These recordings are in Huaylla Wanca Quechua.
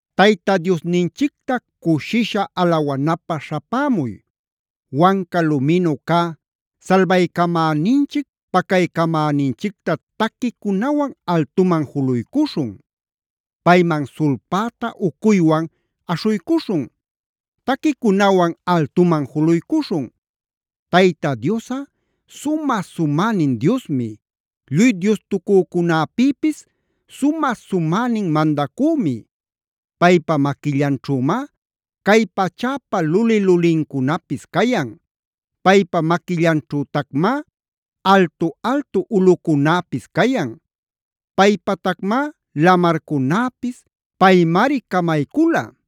¡Tayta Diosninchicta cushisha alawanapä śhapämuy! ¡Wanca luminu cä salbaycamäninchic pacaycamäninchicta taquicunawan altuman juluycuśhun! Payman sulpäta ucuywan aśhuycuśhun. Taquicunawan altuman juluycuśhun. Tayta Diosꞌa sumä-sumänin Diosmi. Lluy diostucücunäpïpis sumä-sumänin Mandacümi. Paypa maquillanćhümá cay pachäpa luli-lulincunapis cayan. Paypa maquillanćhütacmá altu-altu ulꞌucunäpis cayan. Paypatacmá lamarcunäpis; paymari camaycula.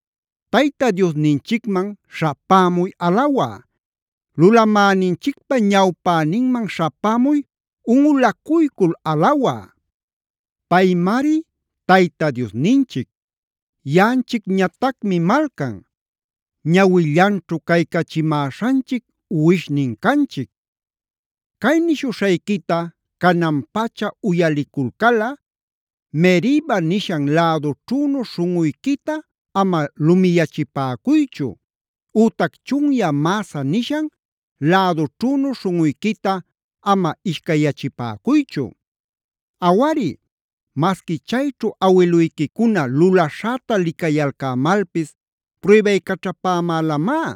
Tayta Diosninchicman śhapämuy alawä. Lulamäninchicpa ñawpäninman śhapämuy unꞌulacuycul alawä. Paymari Tayta Diosninchic. Yaꞌanchicñatacmi malcan, ñawillanćhu caycachimäśhanchic uwishnin canchic. Cay nishuśhayquita canan-pacha uyaliculcalꞌa: “Meriba nishan lädućhünu śhunꞌuyquita ama lumiyachipäcuychu,b ütac chunyä Masah nishan lädućhünu śhunꞌuyquita ama ishcayyachipäcuychu. Awari, masqui chayćhu awiluyquicuna lulaśhäta licayalcämalpis pruybaycaćhapämälamá.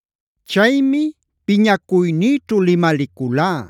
Chaymi piñacuynïćhu limaliculá: